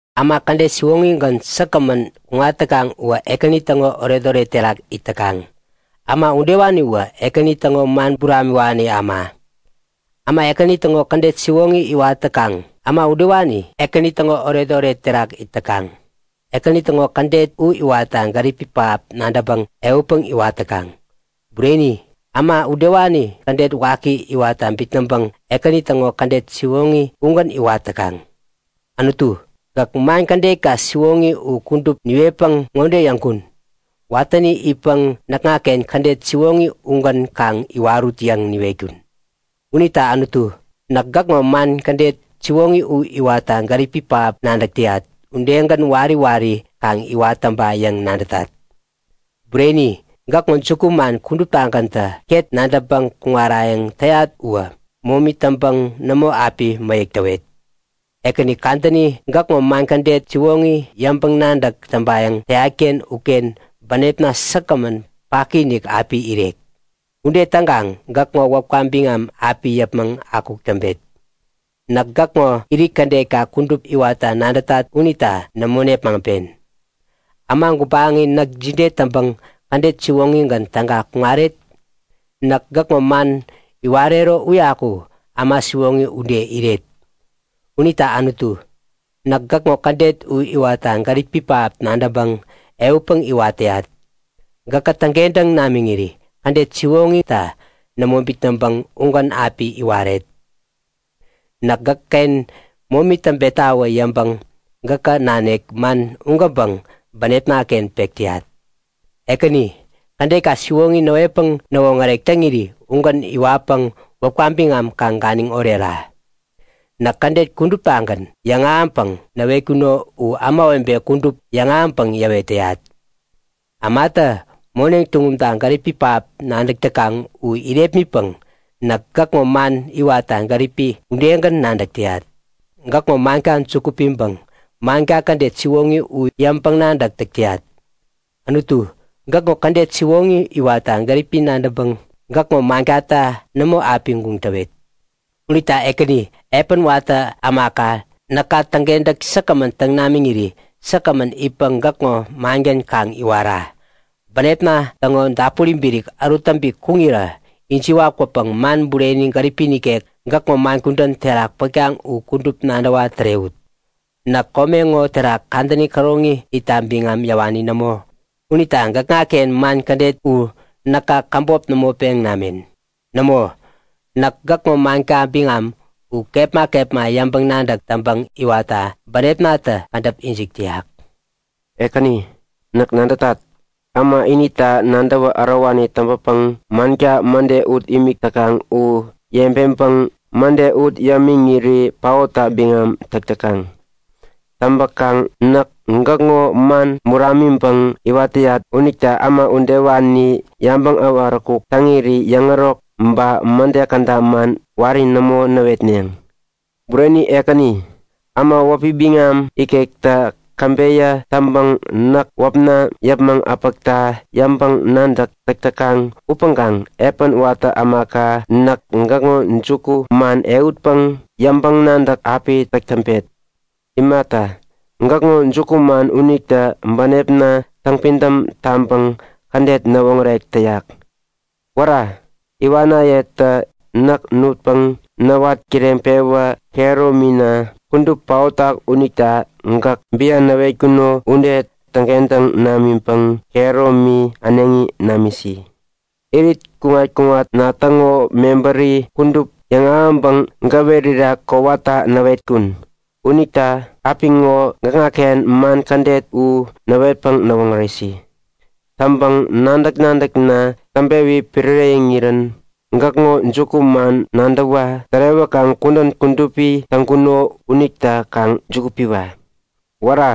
Äma kädet siwoŋigän säkgämän kuŋat täkaŋ uwä Ekäni täŋo oretoret terak it täkaŋ. Äma udewaniwä Ekäni täŋo man buramiwani äma. Äma Ekäni täŋo kädet siwoŋi iwat täkaŋ, äma udewani Ekäni täŋo oretoret terak it täkaŋ. Ekäni täŋo kädet u iwatta gäripi pähap nadäŋpäŋ ehutpäŋ iwat täkaŋ. Bureni-inik, äma udewani kädet waki iwatta bitnäŋpäŋ Ekäni täŋo kädet siwoŋi ugän iwat täkaŋ. Anutu, gäk man kädetka siwoŋi u kudup niwetpäŋ ŋode yäŋkun; Watäni itpäŋ näkŋaken kädet siwoŋi ugän kaŋ iwarut yäŋ niwetkun. Unita Anutu, näk gäkŋo man kädet siwoŋi u iwatta gäripi pähap nadäk täyat udegän wari wari kaŋ iwat täŋpa yäŋ nadätat! Bureni, gäkŋo jukuman kuduptagänta ket nadäŋpäŋ kuŋarayäŋ täyat uwä momi täŋpäŋ nämo api mäyäk täwet. Ekäni, kadäni gäkŋo man kädet siwoŋi yäŋpäŋ-nadäk täŋpayäŋ täyatken uken bänepna säkgämän paki-inik api irek. Ude täŋkaŋ gäkŋo wäpka biŋam api yäpmäŋ akuk täŋpet. Näk gäkŋo irit kädetka kudup iwatta nadätat unita nämo nepmaŋpen. Äma gubaŋi näk jide täŋpäŋ kädet siwoŋigän täga kuŋaret? Näk gäkŋo man iwarero uyaku äma siwoŋi ude iret. Unita Anutu, näk gäkŋo kädet u iwatta gäripi pähap nadäŋpäŋ ehutpäŋ iwat täyat. Gäkä täŋkentäŋ namiŋiri kädet siwoŋita nämo bitnäŋpäŋ ugän api iwaret. Näk gäkken momi täŋpetawä yäŋpäŋ gäkä nanik man ugänpäŋ bänepnaken pek täyat. Ekäni, kädetka siwoŋi näwetpäŋ näwoŋärek täŋiri ugän iwatpäŋ wäpka biŋam kaŋ ganiŋ orera. Näk kädet kuduptagän yäŋahäŋpäŋ niwetkuno u ämawebe kudup yäŋahäŋpäŋ yäwet täyat. Ämatä moneŋ tuŋumta gäripi pähap nadäk täkaŋ u irepmitpäŋ näk gäkŋo man iwatta gäripi udegän nadäk täyat. Gäkŋo manka juku piŋpäŋ manka kädet siwoŋi u yäŋpäŋ-nadäk täk täyat. Anutu, gäkŋo kädet siwoŋi iwatta gäripi nadäŋpäŋ gäkŋo mankata nämo api guŋ täwet. Unita Ekäni, epän watä ämaka näka täŋkentäk säkgämän täŋ namiŋiri säkgämän itpäŋ gäkŋo mangän kaŋ iwara. Bänepna täŋo dapuri birik ärut täŋpi kuŋirä ijiwa-kwäpäŋ man bureni gäripi nikek gäkŋo man kudän terak pätkaŋ u kudup nadäwa tärewut. Näk kome ŋo terak kadäni käroŋi itta biŋam yäwani nämo unita gäkŋaken man kädet u näka käbop nämo peŋ namen. Nämo! Näk gäkŋo manka biŋam u kepma kepma yäŋpäŋ-nadäk täŋpäŋ iwatta bänepnatä kädäp ijik täyak. Ekäni, näk nadätat. Äma inita nadäwä ärowani täŋpäpäŋ manka mäde ut imik täkaŋ u yebeŋpäŋ mäde ut yämiŋiri paotta biŋam täk täkaŋ. Täŋpäkaŋ näk gäkŋo man buramiŋpäŋ iwat täyat unita äma udewani yabäŋ äwaräkuk täŋiri yäŋärok ba mäde käda man wari nämo näwetneŋ. Bureni Ekäni, äma wäpi biŋam ikektä käbeyä täŋpäŋ näk wäpna yäpmäŋ äpäkta yäŋpäŋ-nadäk täk täkaŋ upäŋkaŋ epän watä ämaka näk gäkŋo jukuman ehutpäŋ yäŋpäŋ-nadäk api täk täŋpet. Imata, gäkŋo jukuman unitä bänepna täŋpidäm taŋpäŋ kädet näwoŋärek täyak. Wära! Iwanayetä näk nutpäŋ näwat kireŋpewä kehäromina kudup paotak unita gäk bian näwetkuno ude täŋkentäŋ namiŋpäŋ kehäromi äneŋi namisi. Irit kuŋat-kuŋatna täŋo mebäri kudup yäŋahäŋpäŋ gäwerira kowata näwetkun. Unita apiŋo gäkŋaken man kädet u näwetpäŋ näwoŋäresi! Täŋpäŋ nadäk-nadäkna täŋpewi piräreŋirän gäkŋo jukuman nadäwa tärewäkaŋ kudän kudupi täŋkuno unita kaŋ juku piwa. Wära!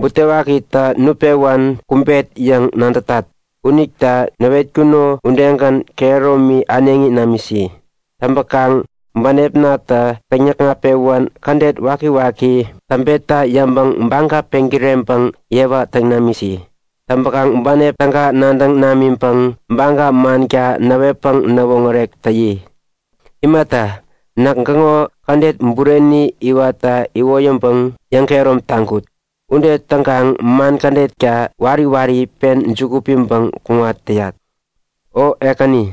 Butewakitä nutpewän kumbet yäŋ nadätat unita näwetkuno udegän kehäromi äneŋi namisi. Täŋpäkaŋ bänepnatä täŋ-näkŋat-pewän kädet wakiwaki täŋpetta yäŋpäŋ baga peŋkireŋpäŋ yewa täŋ namisi. Täŋpäŋ bänep täga nadäŋ namiŋpäŋ baga manka näwetpäŋ näwoŋärek täyi. Imata, näk gäkŋo kädet bureni iwatta iwoyäŋpäŋ yäŋkehärom taŋkut. Ude täŋkaŋ man kädetka wari wari pen juku piŋpäŋ kuŋat täyat. O Ekäni,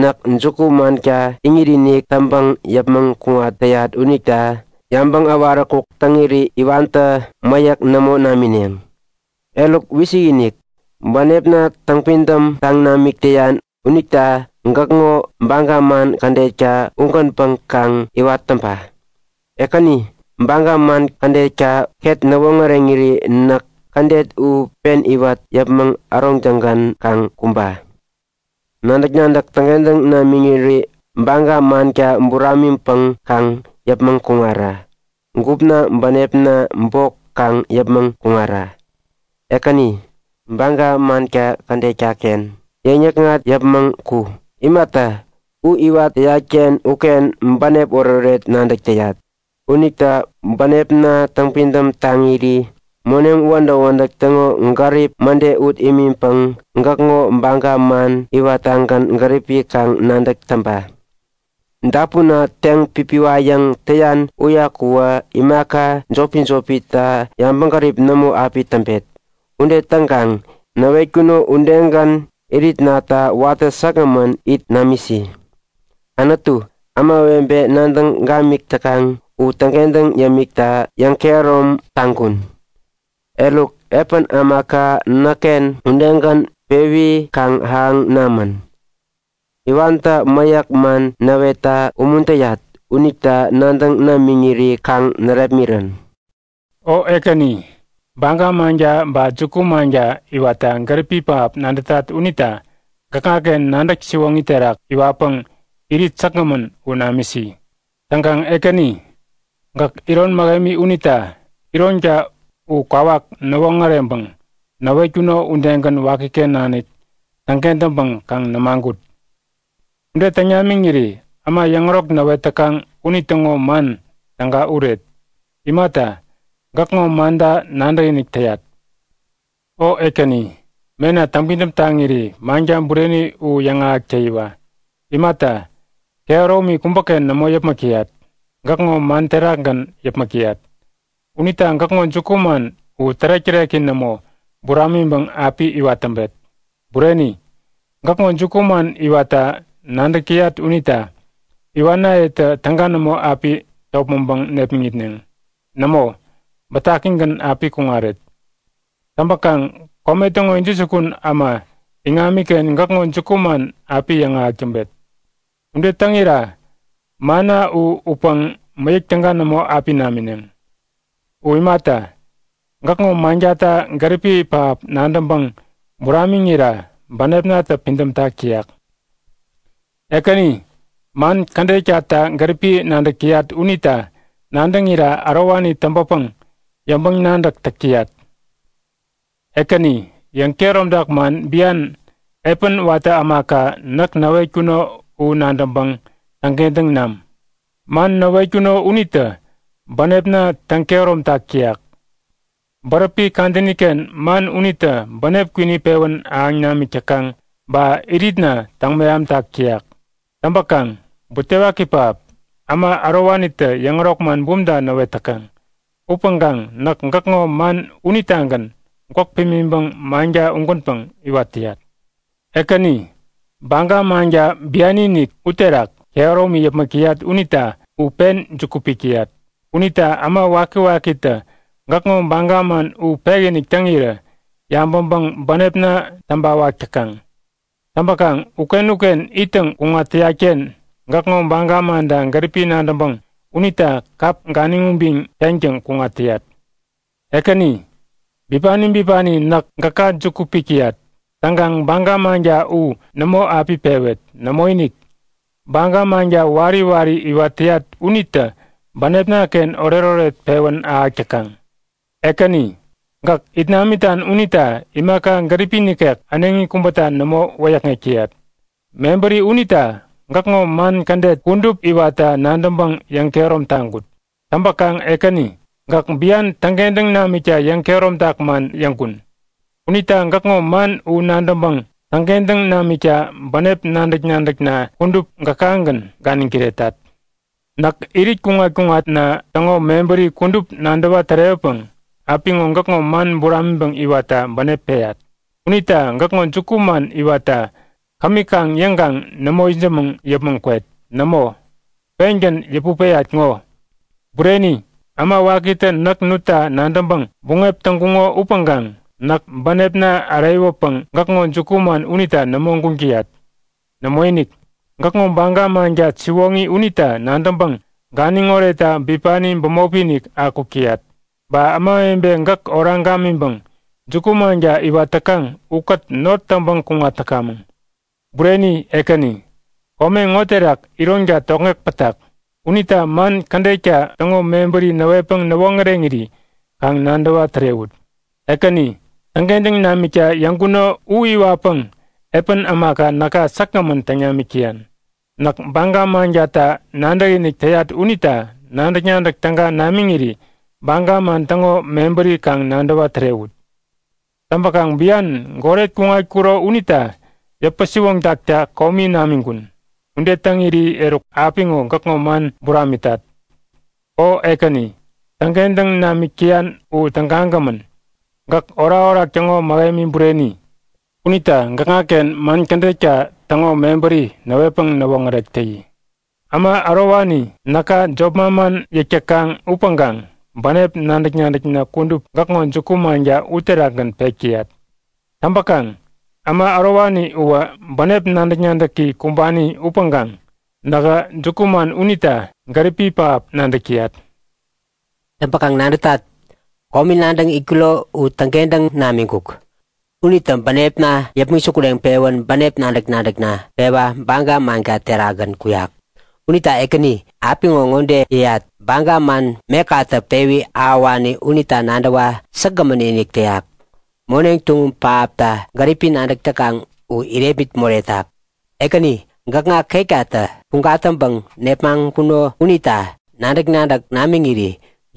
näk juku-manka iŋit-inik täŋpäŋ yäpmäŋ kuŋat täyat unita yabäŋ äwaräkuk täŋiri iwantä mäyäk nämo namineŋ! Eruk, wisik-inik! Bänepna täŋpidäm taŋ namik täyan unita gäkŋo baga man kädetka ugänpäŋ kaŋ iwat täŋpa! Ekäni, baga man kädetka ket näwoŋäreŋiri näk kädet u pen iwat yäpmäŋ äroŋtäŋgän kaŋ kumba! Nadäk-nadäk täŋkentäŋ namiŋiri baga manka buramiŋpäŋ kaŋ yäpmäŋ kuŋara. Gupna bänepna bok kaŋ yäpmäŋ kuŋara! Ekäni, baga manka kädetkaken yäŋnäkŋat yäpmäŋ ku. Imata, u iwat täyatken uken bänep oretoret nadäk täyat. Unita bänepna täŋpidäm taŋiri moneŋ wädäk-wädäk täŋo gärip mäde ut imiŋpäŋ gäkŋo baga man iwattagän gäripi kaŋ nadäk täŋpa! Dapunna teŋ-pipiwayäŋ täyan uyakuwä imaka jopi-jopita yabäŋgärip nämo api täŋpet. Ude täŋkaŋ näwetkuno udegän iritnata watä säkgämän it namisi. Anutu, ämawebe nadäŋ gamik täkaŋ u täŋkentäŋ yämikta yäŋkehärom taŋkun. Eruk, epän ämaka näkken udegän pewi kaŋ ahäŋ namän. Iwantä mäyäk man näwetta umuntäyat unita nadäŋ namiŋiri kaŋ närepmirän. O Ekäni, baga manka ba juku-manka iwatta gäripi pähap nadätat unita gäkŋaken nadäk siwoŋi terak iwatpäŋ irit säkgämän u namisi. Täŋkaŋ Ekäni, gäk iron mähemi unita ironka u kwawak näwoŋäreŋpäŋ näwetkuno udegän wakiken nanik täŋken täŋpäŋ kaŋ nämagut. Ude täŋ namiŋiri äma yäŋärok näwet täkaŋ unitäŋo man täga uret. Imata, gäkŋo manta nadäkinik täyat unita. O Ekäni, mena täŋpidäm taŋiri manka bureni u yäŋahäk täyiwa. Imata, kehäromi kubäken nämo yäpmäk täyat, gäkŋo man terakgän yäpmäk täyat. Unita gäkŋo jukuman u tärek-täreki nämo buramiŋpäŋ api iwat täŋpet. Bureni, gäkŋo jukuman iwatta nadäk täyat unita iwanayetä täga nämo api topmäŋpäŋ nepmäŋitneŋ. Nämo, bätakigän api kuŋaret. Täŋpäkaŋ kome täŋo intäjukun äma iŋamiken gäkŋo jukuman api yäŋahäk täŋpet. Ude täŋira manna u utpäŋ mäyäk täga nämo api namineŋ. U imata, gäkŋo mankata gäripi pähap nadäŋpäŋ buramiŋira bänepnatä pidämtak täyak. Ekäni, man kädetkata gäripi nadäk täyat unita nadäŋira ärowani täŋpäpäŋ yäŋpäŋ-nadäk täk täyat. Ekäni, yäŋkehäromtak man bian epän watä ämaka näk näwetkuno u nadäŋpäŋ täŋkentäŋ nam. Man näwetkuno unitä bänepna täŋ-kehäromtak täyak. Bäräpi kadäniken man unitä bänep kwini pewän ahäŋ namik täkaŋ ba iritna täŋ-mehamtak täyak. Täŋpäkaŋ butewaki pähap! Äma ärowanitä yäŋärok man bumta näwet täkaŋ. Upäŋkaŋ näk gäkŋo man unitagän gwäk pimiŋpäŋ manka ugänpäŋ iwat täyat. Ekäni, baga manka bianiinik uterak kehäromi yäpmäk täyat unita u pen juku pik täyat. Unita äma wakiwakitä gäkŋo baga man u pekinik täŋirä yabäŋpäŋ bänepna täŋpäwak täkaŋ. Täŋpäkaŋ uken-uken ittäŋ kuŋat täyatken gäkŋo baga manta gäripi nadäŋpäŋ unita kap ganiŋ ubiŋ teŋtäŋ kuŋat täyat. Ekäni, bipani bipani näk gäka juku pik täyat. Täŋkaŋ baga manka u nämo api pewet. Nämoinik! Baga manka wari wari iwat täyat unitä bänepnaken oretoret pewän ahäk täkaŋ. Ekäni, gäk it namitan unita imaka gäripi nikek äneŋi kubäta nämo wäyäkŋek täyat. Mebäri unita gäkŋo man kädet kudup iwatta nadäŋpäŋ yäŋkehärom taŋkut. Täŋpäkaŋ Ekäni, gäk bian täŋkentäŋ namikta yäŋkehäromtak man yäŋkun. Unita gäkŋo man u nadäŋpäŋ täŋkentäŋ namikta bänep nadäk-nadäkna kudup gäkagän ganiŋ kiretat. Näk irit kuŋat-kuŋatna täŋo mebäri kudup nadäwa-tärewäpäŋ apiŋo gäkŋo man buramiŋpäŋ iwatta bänep peyat. Unita gäkŋo jukuman iwatta kämi kaŋ yäŋkaŋ nämo itsämäŋ yäpmäŋ kwet. Nämo, pengän yäput peyat ŋo. Bureni, äma wakitä näk nutta nadäŋpäŋ buŋep täŋkuŋo upäŋkaŋ näk bänepna äreyäwäpäŋ gäkŋo jukuman unita nämo guŋ täyat. Nämoinik, gäkŋo baga manka siwoŋi unita nadäŋpäŋ ganiŋ oretta bipani bämop-inik akuk täyat. Ba ämawebe gäk oraŋ gamiŋpäŋ juku-manka iwat täkaŋ ukät not täŋpäŋ kuŋat täkamäŋ. Bureni Ekäni, kome ŋo terak ironka tokŋeŋ pätak. Unita man kädetka täŋo mebäri näwetpäŋ näwoŋäreŋiri kaŋ nadäwa tärewut! Ekäni, täŋkentäŋ namikta yäŋkuno u iwatpäŋ epän ämaka näka säkgämän täŋ namik täyan. Näk baga mankata nadäkinik täyat unita nadäk-nadäk täga namiŋiri baga man täŋo mebäri kaŋ nadäwa tärewut. Täŋpäkaŋ bian goret kuŋatkuro unita yäpä-siwoŋtakta komi namiŋkun. Ude täŋiri eruk apiŋo gäkŋo man buramitat. O Ekäni, täŋkentäŋ namik täyan u tägagämän. Gäk orakorak täŋo mähemi bureni. Unita gäkŋaken man kädetka täŋo mebäri näwetpäŋ näwoŋärek täyi. Äma ärowani näka jop manman yäk täkaŋ upäŋkaŋ bänep nadäk-nadäkna kudup gäkŋo juku-manka uterakgän pek täyat. Täŋpäŋ äma ärowani uwä bänep nadäk-nadäki kumbani upäŋkaŋ nähä juku-manka unita gäripi pähap nadäk täyat. Täŋpäkaŋ nadätat; Komi nadäŋ itkuro u täŋkentäŋ namiŋkuk. Unitä bänepna yäpmäŋ sukureŋpewän bänep nadäk-nadäkna pewa baga manka terakgän kuyak. Unita Ekäni, apiŋo ŋode yäyat; Baga man mekatä pewi ahäwani unita nadäwa säkgämän-inik täyak, moneŋ tuŋum pähapta gäripi nadäk täkaŋ u irepmit moretak! Ekäni, gäkŋa ketkatä puŋ gatäŋpäŋ nepmaŋkuno unita nadäk-nadäk namiŋiri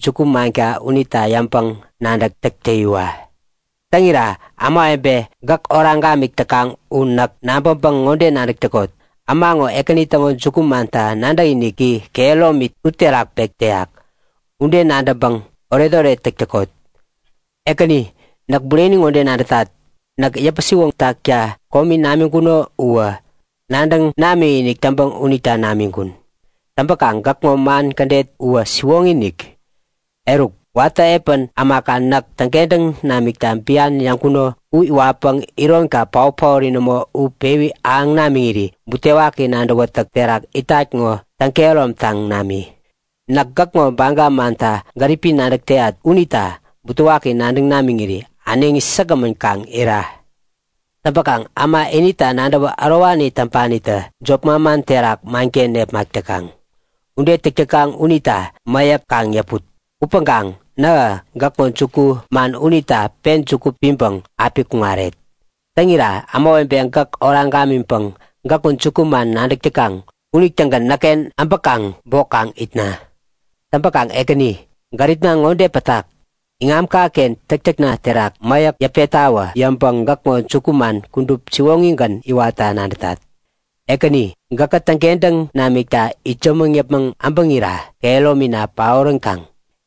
juku-manka unita yäŋpäŋ-nadäk täk täyiwa! Täŋira ämawebe gäk oraŋ gamik täkaŋ u näk nabäŋpäŋ ŋode nadäk täkot; Äma ŋo Ekäni täŋo jukumanta nadäkiniki kehäromi uterak pek täyak! Ude nadäŋpäŋ oretoret täk täkot. Ekäni, näk bureni ŋode nadätat; Näk yäpä-siwoŋtakta komi namiŋkuno uwä nadäŋ namikinik täŋpäŋ unita namiŋkun. Täŋpäkaŋ gäkŋo man kädet uwä siwoŋi-inik. Eruk, watä epän ämaka näk täŋkentäŋ namikta bian yäŋkuno u iwatpäŋ ironka paot-paori nämo u pewi ahäŋ namiŋiri butewaki nadäwätäk terak itat ŋo täŋ-kehäromtaŋ nami. Näk gäkŋo baga manta gäripi nadäk täyat unita butewaki nadäŋ namiŋiri äneŋi säkgämän kaŋ ira. Täŋpäkaŋ äma inita nadäwä ärowani täŋpanitä jop manman terak manken nepmak täkaŋ. Ude täk täkaŋ unita mäyäk kaŋ yäput! Upäŋkaŋ nähä gäkŋo jukuman unita pen juku piŋpäŋ api kuŋaret. Täŋira ämawebe gäk oraŋ gamiŋpäŋ gäkŋo jukuman nadäk täkaŋ unitägän näkken äbäkaŋ bok kaŋ itna. Täŋpäkaŋ Ekäni, gäripna ŋode pätak; Iŋamkaken täktäkna terak mäyäk yäpettawä yäŋpäŋ gäkŋo jukuman kudup siwoŋigän iwatta nadätat. Ekäni, gäkä täŋkentäŋ namikta itsämäŋ yäpmäŋ äbäŋira kehäromina paoränkaŋ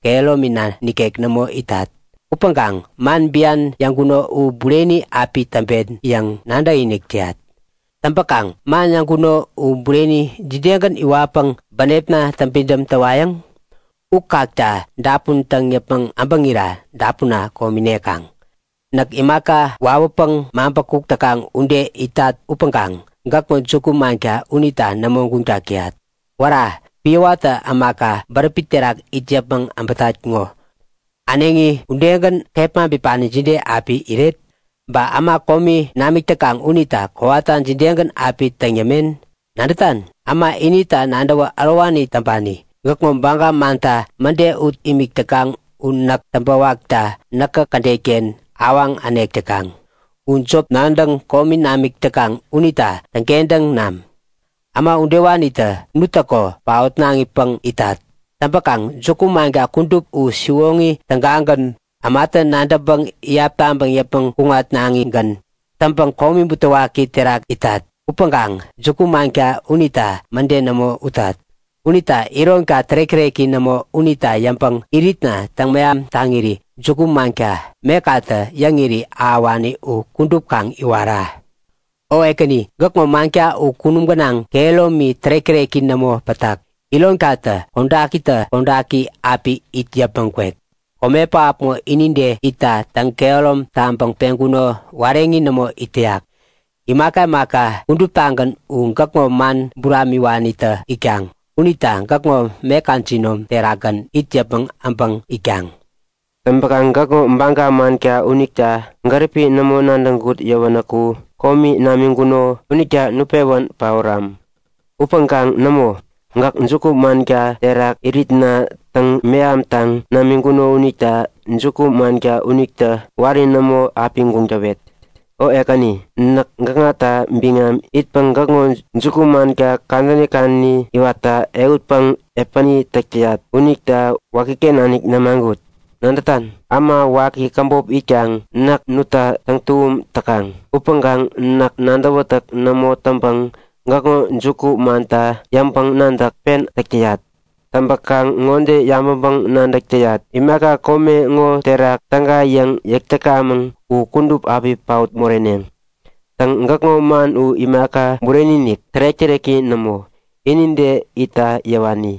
kehäromina nikek nämo itat. Upäŋkaŋ man bian yäŋkuno u bureni api täŋpen yäŋ nadäkinik täyat. Täŋpäkaŋ man yäŋkuno u bureni jidegän iwatpäŋ bänepna täŋpidäm täwayäŋ? U kakta dapun täŋ yäpmäŋ äbäŋira dapunna komi nekaŋ. Näk imaka wawäpäŋ maŋpäkuk täkaŋ ude itat upäŋkaŋ gäkŋo juku-manka unita nämo guŋtak täyat. Wära! Piä watä ämaka bäräpi terak it yäpmäŋ äbätat ŋo äneŋi udegän kepma bipani jide api iret? Ba äma komi namik täkaŋ unita kowata jidegän api täŋ yämen? Nadätan? Äma inita nadäwä ärowani täŋpani, gäkŋo baga manta mäde ut imik täkaŋ u näk täŋpäwakta näkä kädetken awaŋ änek täkaŋ. U jop nadäŋ komi namik täkaŋ unita täŋkentäŋ nam! Äma udewanitä nuttäko paotnaŋipäŋ itat. Täŋpäkaŋ juku-manka kudup u siwoŋi tägagän, ämatä nadäŋpäŋ iyap taŋpäŋ yäpmäŋ kuŋatnaŋigän. Täŋpäŋ komi butewaki terak itat upäŋkaŋ juku-manka unita mäde nämo utat. Unita ironka tärek-täreki nämo unita yäŋpäŋ iritna täŋmeham taŋiri juku-manka, mekatä yäŋiri ahäwani u kudup kaŋ iwara. O Ekäni, gäkŋo manka u kunum gänaŋ, kehäromi tärek-täreki nämo pätak. Ironkatä kodakitä kodaki api it yäpmäŋ kwek. Kome pähap ŋo inide itta täŋ-kehärom taŋpäŋ peŋkuno wareŋi nämo it täyak. Imaka imaka kuduptagän u gäkŋo man buramiwanitä itkaŋ unita gäkŋo meka jinom terakgän it yäpmäŋ äbäŋ itkaŋ. Täŋpäkaŋ gäkŋo baga manka unita gäripi nämo nadäŋkut yäwänäku komi namiŋkuno unitä nutpewän paoram. Upäŋkaŋ nämo! Gäk juku-manka terak iritna täŋ-mehamtaŋ namiŋkuno unita juku-manka unita wari nämo api guŋ täwet. O Ekäni, näk gäkŋata biŋam itpäŋ gäkŋo juku-manka kadäni kadäni iwatta ehutpäŋ epäni täk täyat unita wakiken nanik nämagut. Nadätan? Äma waki käbop itkaŋ näk nutta täŋtuŋum täkaŋ. Upäŋkaŋ näk nadäwätäk nämo täŋpäŋ gäkŋo jukumanta yäŋpäŋ-nadäk pen täk täyat. Täŋpäkaŋ ŋode yabäŋpäŋ-nadäk täyat; Imaka kome ŋo terak täga yäŋ yäk täkamäŋ u kudup api paot moreneŋ. Täŋ gäkŋo man u imaka bureni-inik, tärek-täreki nämo, inide itta yäwani.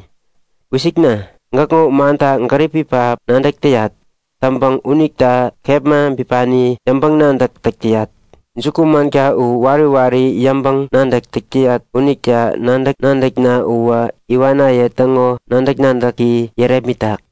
Wisikna! Gäkŋo manta gäripi pähap nadäk täyat. Täŋpäŋ unita kepma bipani yäŋpäŋ-nadäk täk täyat. Jukumanka u wari wari yäŋpäŋ-nadäk täk täyat unita nadäk-nadäkna uwä iwanaye täŋo nadäk-nadäki yärepmitak.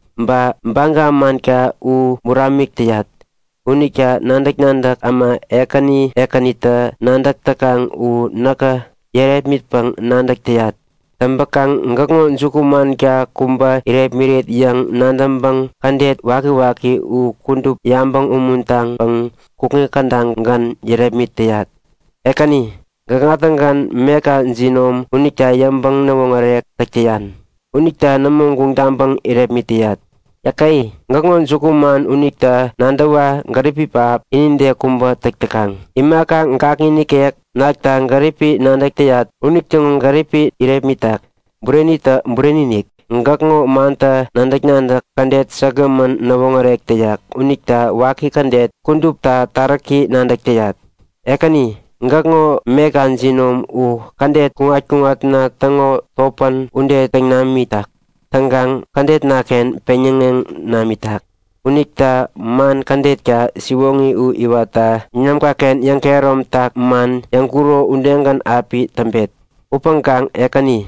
Ba baga manka u buramik täyat unita nadäk-nadäk äma ekäni ekänitä nadäk täkaŋ u näkä yärepmitpäŋ nadäk täyat. Täŋpäkaŋ gäkŋo juku-manka kubä irepmiret yäŋ nadäŋpäŋ kädet wakiwaki u kudup yabäŋ umuntaŋpäŋ kukŋi kädagän yärepmit täyat. Ekäni, gäkŋa-tägän meka jinom unita yäŋpäŋ-näwoŋärek täk täyan unita nämo guŋ taŋpäŋ irepmit täyat. Yäke! Gäkŋo jukuman unita nadäwa gäripi pähap, inide kubä täk täkaŋ, imaka gakŋi nikek nakta gäripi nadäk täyat unitäŋo gäripi irepmitak. Burenitä bureni-inik, gäkŋo mantä nadäk-nadäk kädet säkgämän näwoŋärek täyak unita waki kädet kudupta taräki nadäk täyat. Ekäni, gäkŋo meka jinom u kädet kuŋat-kuŋatna täŋo topän ude täŋ namitak. Täŋkaŋ kädetnaken peŋyäŋeŋ namitak. Unita man kädetka siwoŋi u iwatta iŋamkaken yäŋkehäromtak man yäŋkuro udegän api täŋpet. Upäŋkaŋ Ekäni,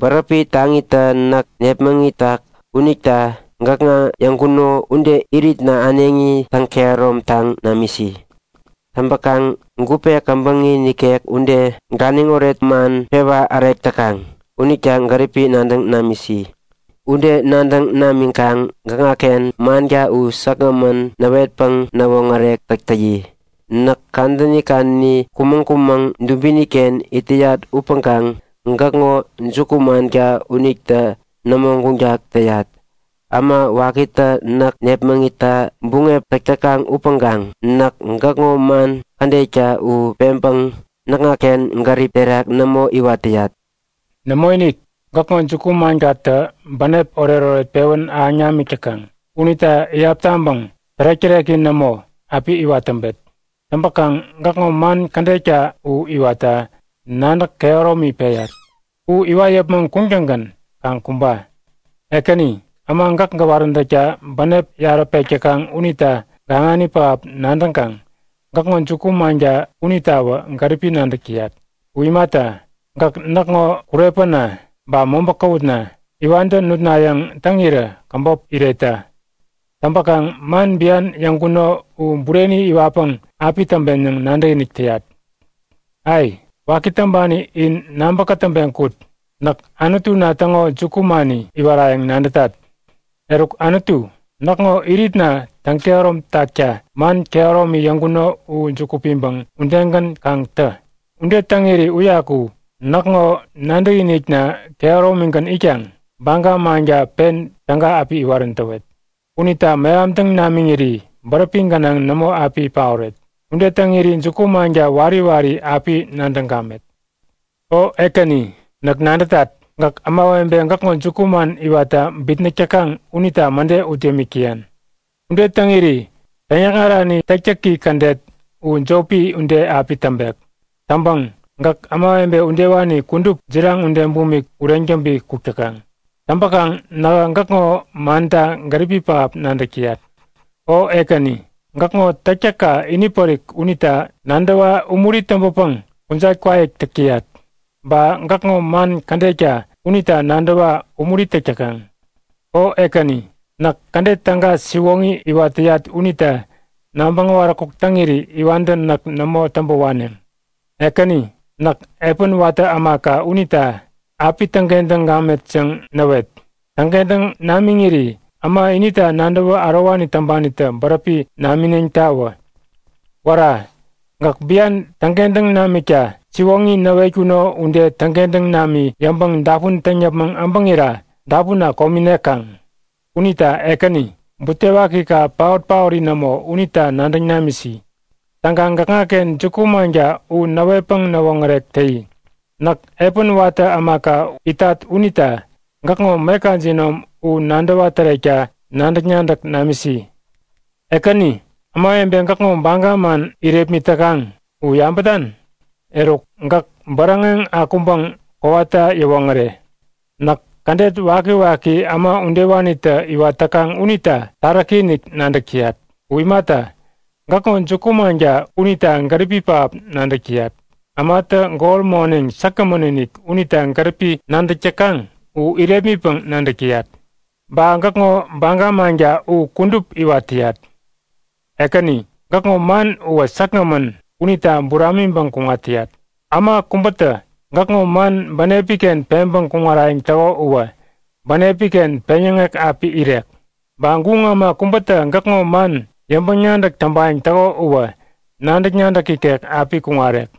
bäräpi taŋitä näk nepmäŋitak unita gäkŋa yäŋkuno ude iritna äneŋi täŋ-kehäromtaŋ namisi. Täŋpäkaŋ gupe käbäŋi nikek ude, ganiŋoret man pewa-ärek täkaŋ unita gäripi nadäŋ namisi. Ude nadäŋ namiŋkaŋ gäkŋaken manka u säkgämän näwetpäŋ näwoŋärek täk täyi. Näk kadäni kadäni kumäŋ-kumäŋ dubiniken it täyat upäŋkaŋ gäkŋo juku-manka unita nämo guŋtak täyat. Äma wakitä näk nepmäŋitta buŋep täk täkaŋ upäŋkaŋ näk gäkŋo man kädetka u peŋpäŋ näkŋaken gärip terak nämo iwat täyat. Nämoinik, gäkŋo juku-mankatä bänep oretoret pewän ahäŋ namik täkaŋ. Unita iyap taŋpäŋ tärek-täreki nämo api iwat täŋpet. Täŋpäŋ gäkŋo man kädetka u iwatta nadäk kehäromi peyat. U iwat yäpmäŋ kuŋtäŋgän kaŋ kumba! Ekäni, äma gäk gäwaräntäkta bänep yarä pek täkaŋ unita gaŋani pähap nadäŋkaŋ gäkŋo juku-manka unitawä gäripi nadäk täyat. U imata, gäk näkŋo kurepäna ba mobä käwutna, iwantä nutnayäŋ täŋirä käbop iretta. Täŋpäkaŋ man bian yäŋkuno u bureni iwatpäŋ api täŋpen yäŋ nadäkinik täyat. Ai! Waki täŋpani in nabä kätäŋpeŋ kut! Näk Anutuna täŋo jukumani iwarayäŋ nadätat! Eruk Anutu, näkŋo iritna täŋ-kehäromtakta man kehäromi yäŋkuno u juku piŋpäŋ udegän kaŋ tä. Ude täŋiri uyaku näkŋo nadäkinikna kehäromigän itkaŋ baga manka pen täga api iwarän täwet. Unita mehamtäŋ namiŋiri bäräpi gänaŋ nämo api paoret. Ude täŋiri juku-manka wari wari api nadäŋ gamet. O Ekäni, näk nadätat. Gäk ämawebe gäkŋo jukuman iwatta bitnäk täkaŋ unita mäde ut yämik täyan. Ude täŋiri täŋyäkŋarani täktäki kädet u jopi ude api täŋpek. Täŋpäŋ, gäk ämawebe udewani kudup jiraŋ ude bumik ureŋ täŋpi kuk täkaŋ. Täŋpäkaŋ nähä gäkŋo manta gäripi pähap nadäk täyat. O Ekäni, gäkŋo täktäkka inipärik unita nadäwa umuri täŋpäpäŋ kujat kwaik täk täyat. Ba gäkŋo man kädetka unita nadäwa umuri täk täkaŋ. O Ekäni, näk kädet täga siwoŋi iwat täyat unita nabäŋ äwaräkuk täŋiri iwantä näk nämo täŋpä waneŋ! Ekäni, näk epän watä ämaka unita api täŋkentäŋ gamet yäŋ näwet. Täŋkentäŋ namiŋiri äma inita nadäwä ärowani täŋpanitä bäräpi namineŋtawä. Wära! Gäk bian täŋkentäŋ namikta siwoŋi näwetkuno ude täŋkentäŋ nami yäŋpäŋ dapun täŋ yäpmäŋ äbäŋira dapunna komi nekaŋ. Unita Ekäni, butewakika paot-paori nämo unita nadäŋ namisi! Täŋkaŋ gäkŋaken juku-manka u näwetpäŋ näwoŋärek täyi. Näk epän watä ämaka itat unita gäkŋo meka jinom u nadäwa-tärekta nadäk-nadäk namisi. Ekäni, ämawebe gäkŋo baga man irepmit täkaŋ u yabätan? Eruk, gäk bäräŋeŋ akuŋpäŋ kowata yäwoŋäre! Näk kädet wakiwaki äma udewanitä iwat täkaŋ unita taräki-inik nadäk täyat. U imata, gäkŋo juku-manka unita gäripi pähap nadäk täyat, ämatä gol moneŋ säkgämän-inik unita gäripi nadäk täkaŋ u irepmitpäŋ nadäk täyat. Ba gäkŋo baga manka u kudup iwat täyat. Ekäni, gäkŋo man uwä säkgämän unita buramiŋpäŋ kuŋat täyat. Äma kubätä gäkŋo man bänepiken peŋpäŋ kuŋarayäŋ täko uwä bänepiken peŋyäŋek api irek. Ba guŋ äma kubätä gäkŋo man yäŋpäŋ-nadäk täŋpayäŋ täko uwä nadäk-nadäk ikek api kuŋarek.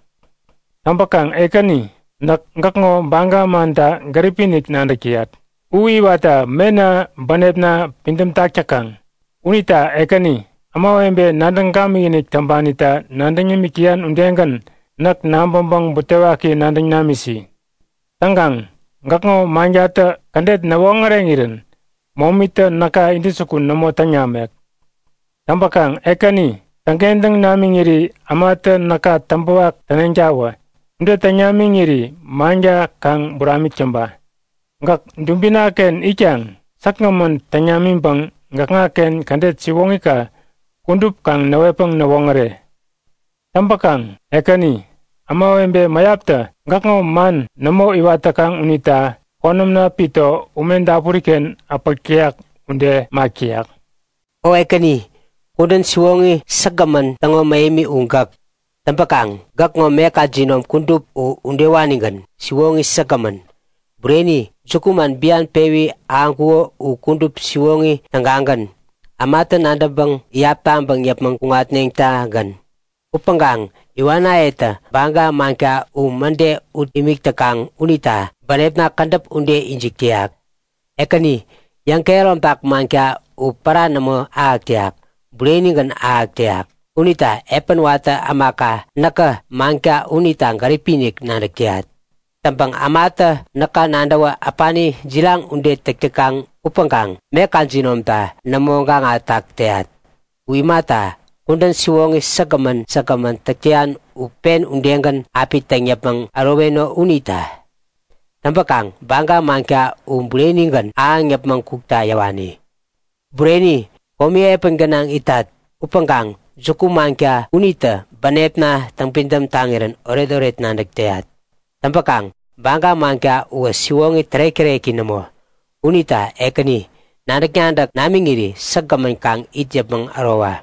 Täŋpäkaŋ Ekäni, näk gäkŋo baga manta gäripi-inik nadäk täyat. U iwatta mena bänepna pidämtak täkamän. Unita Ekäni, ämawebe nadäŋ gamikinik täŋpanita nadäŋ yämik täyan udegän, näk nabäŋpäŋ butewaki nadäŋ namisi. Täŋkaŋ gäkŋo mankatä kädet näwoŋäreŋirän momitä näka intäjukun nämo täŋ namek. Täŋpäkaŋ Ekäni, täŋkentäŋ namiŋiri ämatä näka täŋpäwak täneŋtawä. Ude täŋ namiŋiri manka kaŋ buramik täŋpa. Gäk dubinaken itkaŋ säkgämän täŋ namiŋpäŋ gäkŋaken kädet siwoŋika kudup kaŋ näwetpäŋ näwoŋäre. Täŋpäkaŋ Ekäni, ämawebe mäyaptä gäkŋo man nämo iwat täkaŋ unita konämna pito ume dapuriken äpäk täyak ude mak täyak. O Ekäni, kudän siwoŋi säkgämän täŋo mähemi u gäk. Täŋpäkaŋ gäkŋo meka jinom kudup u udewanigän, siwoŋi säkgämän. Bureni, jukuman bian pewi ahäŋkuŋo u kudup siwoŋi tägagän, ämatä nadäŋpäŋ iyap taŋpäŋ yäpmäŋ kuŋatneŋtagän. Upäŋkaŋ iwanayetä baga manka u mäde ut imik täkaŋ unita bänepna kädäp ude ijik täyak. Ekäni, yäŋkehäromtak manka u pära nämo ahäk täyak. Burenigän ahäk täyak. Unita epän watä ämaka näkä manka unita gäripi-inik nadäk täyat. Täŋpäŋ ämatä näka nadäwä äpani, jiraŋ ude täk täkaŋ upäŋkaŋ meka jinomta nämo gaŋatak täyat. U imata, kudän siwoŋi säkgämän säkgämän täk täyan u pen udegän api täŋ yäpmäŋ äroweno unita. Täŋpäkaŋ baga manka u burenigän ahäŋ yäpmäŋ kukta yäwani. Bureni, komi epän gänaŋ itat, upäŋkaŋ juku-manka unitä bänepna täŋpidäm taŋirän oretoret nadäk täyat. Täŋpäkaŋ baga manka uwä siwoŋi tärek-täreki nämo. Unita Ekäni, nadäk-nadäk namiŋiri säkgämän kaŋ it yäpmäŋ ärowa!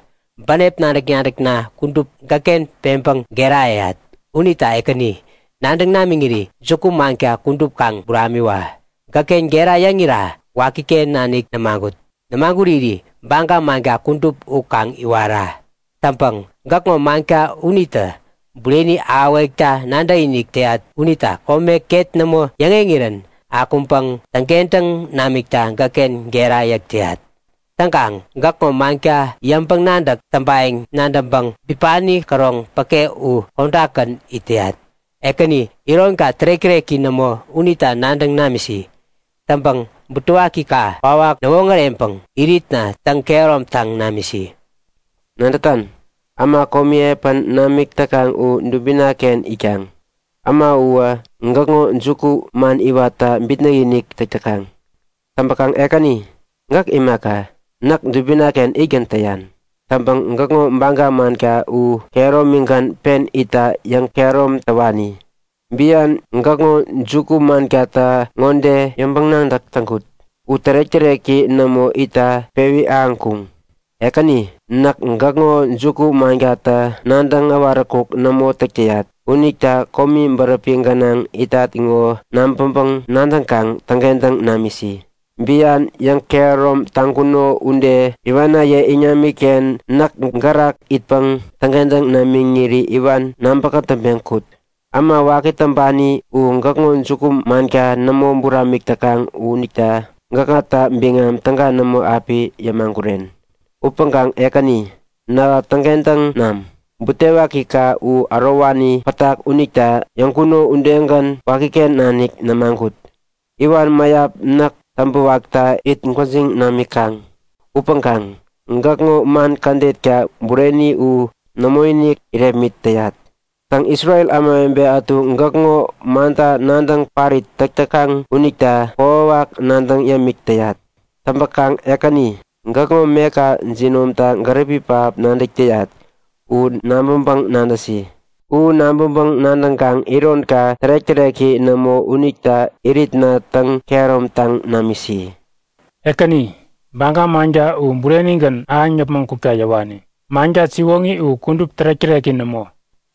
Bänep nadäk-nadäkna kudup gäkken peŋpäŋ gera yäyat. Unita Ekäni, nadäŋ namiŋiri juku-manka kudup kaŋ buramiwa! Gäkken gera yäŋira wakiken nanik nämagut. Nämaguriri baga manka kudup u kaŋ iwara. Täŋpäŋ gäkŋo manka unitä bureni ahäwekta nadäkinik täyat unita kome ket nämo yäŋeŋirän akuŋpäŋ täŋkentäŋ namikta gäkken gera yäk täyat. Täŋkaŋ gäkŋo manka yäŋpäŋ-nadäk täŋpayäŋ nadäŋpäŋ bipani käroŋ päke u kodakgän it täyat. Ekäni, ironka tärek-täreki nämo unita nadäŋ namisi. Täŋpäŋ butewakika kwawak näwoŋäreŋpäŋ iritna täŋ-kehäromtaŋ namisi. Nadätan? Äma komi epän namik täkaŋ u dubinaken itkaŋ. Äma uwä gäkŋo jukuman iwatta bitnäk-inik täk täkaŋ. Täŋpäkaŋ Ekäni, gäk imaka, näk dubinaken itgän täyan. Täŋpäŋ gäkŋo baga manka u kehäromigän pen itta yäŋkehärom täwani. Bian gäkŋo juku-mankata yäŋpäŋ-nadäk ŋode täŋkut; U tärek-täreki nämo itta pewi ahäŋkuŋ. Ekäni, näk gäkŋo juku-mankata nadäŋ äwaräkuk nämo täk täyat unita komi bäräpi gänaŋ itat ŋo nabäŋpäŋ-nadäŋkaŋ täŋkentäŋ namisi. Bian yäŋkehärom taŋkuno ude iwanaye iŋamiken näk gärak itpäŋ täŋkentäŋ namiŋiri iwan nabä-kätäŋpeŋ kut. Äma waki täŋpani u gäkŋo juku-manka nämo buramik täkaŋ unita gäkŋata biŋam täga nämo api yämaguren. Upäŋkaŋ Ekäni, nähä täŋkentäŋ nam! Butewakika u ärowani pätak unita yäŋkuno udegän wakiken nanik nämagut. Iwan mäyap näk täŋpäwakta it gwäjiŋ namikaŋ upäŋkaŋ gäkŋo man kädetka bureni u nämoinik irepmit täyat. Täŋ Isrel ämawebe ätu gäkŋo manta nadäŋ parit täk täkaŋ unita kokwawak nadäŋ yämik täyat. Täŋpäkaŋ Ekäni, gäkŋo meka jinomta gäripi pähap nadäk täyat u nabäŋpäŋ-nadäsi. U nabäŋpäŋ-nadäŋkaŋ ironka tärek-täreki nämo unita iritna täŋ-kehäromtaŋ namisi. Ekäni, baga manka u burenigän ahäŋ yäpmäŋ kukta yäwani. Manka siwoŋi u kudup tärek-täreki nämo.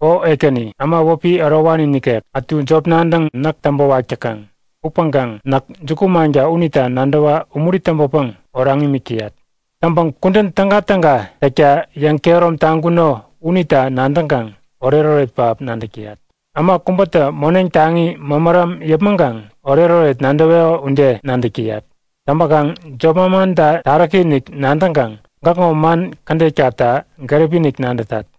O Ekäni, äma wäpi ärowani nikek ätu jop nadäŋ näk täŋpäwak täkaŋ upäŋkaŋ näk juku-manka unita nadäwa umuri täŋpäpäŋ oraŋ imik täyat. Täŋpäŋ kudän tägatäga täkta yäŋkehärom taŋkuno unita nadäŋkaŋ oretoret pähap nadäk täyat. Äma kubätä moneŋ taŋi mämäram yäpmäŋkaŋ oretoret nadäweko ude nadäk täyat. Täŋpäkaŋ jop-manmanta taräki-inik nadäŋkaŋ gäkŋo man kädetkata gäripi-inik nadätat.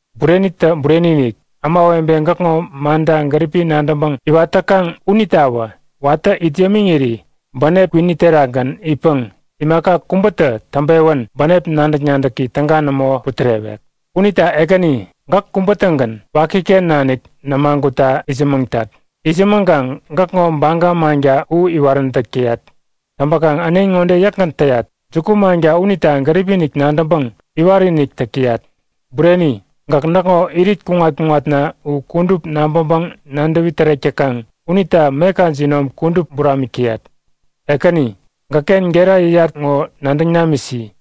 Burenitä bureni-inik! Ämawebe gäkŋo manta gäripi nadäŋpäŋ iwat täkaŋ unitawä watä it yämiŋiri bänep kwini terakgän it täkaŋ imaka kubä täŋpewän bänep nadäk-nadäki täga nämo putärewek. Unita Ekäni, gäk kubä-tägän wakiken nanik nämagutta itsämäŋtat. Itsämäŋkaŋ gäkŋo baga manka u iwaräntäk täyat. Täŋpäkaŋ äneŋi ŋode yäkgän täyat; Jukumanka unita gäripi-inik nadäŋpäŋ iwat-inik täk täyat. Bureni, gäk näkŋo irit kuŋat-kuŋatna u kudup nabäŋpäŋ-nadäwi-tärek täkaŋ unita meka jinom kudup buramik täyat. Ekäni, gäkken gera yäyat ŋo nadäŋ namisi.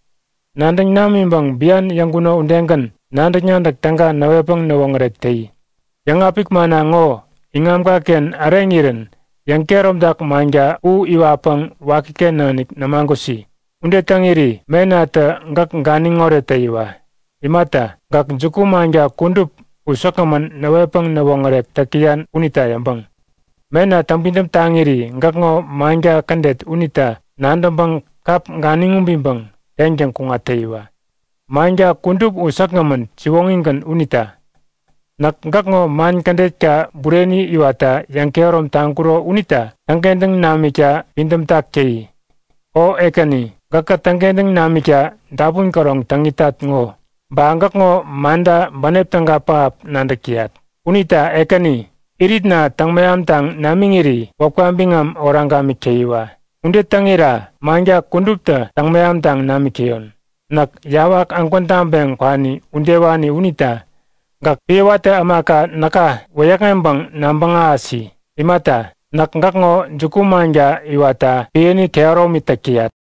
Nadäŋ namiŋpäŋ bian yäŋkuno udegän nadäk-nadäk täga näwetpäŋ näwoŋärek täyi. Yäŋapik manna ŋo iŋamkaken äreŋirän yäŋkehäromtak manka u iwatpäŋ wakiken nanik nämagusi. Ude täŋiri menatä gäk ganiŋoret täyiwa! Imata, gäk juku-manka kudup u säkgämän näwetpäŋ näwoŋärek täk täyan unita yäŋpäŋ. Mena täŋpidäm taŋiri gäkŋo manka kädet unita nadäŋpäŋ kap ganiŋ ubiŋpäŋ teŋtäŋ kuŋat täyiwa, manka kudup u säkgämän siwoŋigän unita. Näk gäkŋo man kädetka bureni iwatta yäŋkehärom taŋkuro unita täŋkentäŋ namikta pidämtak täyi. O Ekäni, gäkä täŋkentäŋ namikta dapun käroŋ täŋ itat ŋo. Ba gäkŋo manta bänep täga pähap nadäk täyat. Unita Ekäni, iritna täŋ-mehamtaŋ namiŋiri wäpka biŋam oraŋ gamik täyiwa. Ude täŋira manka kuduptä täŋ-mehamtaŋ namik täyon. Näk yawak ägwän taŋpeŋ kwani udewani unita gäk epän watä ämaka näka wäyäkŋeŋpäŋ nabäŋ ahäsi. Imata, näk gäkŋo juku-manka iwatta epäni kehäromi täk täyat.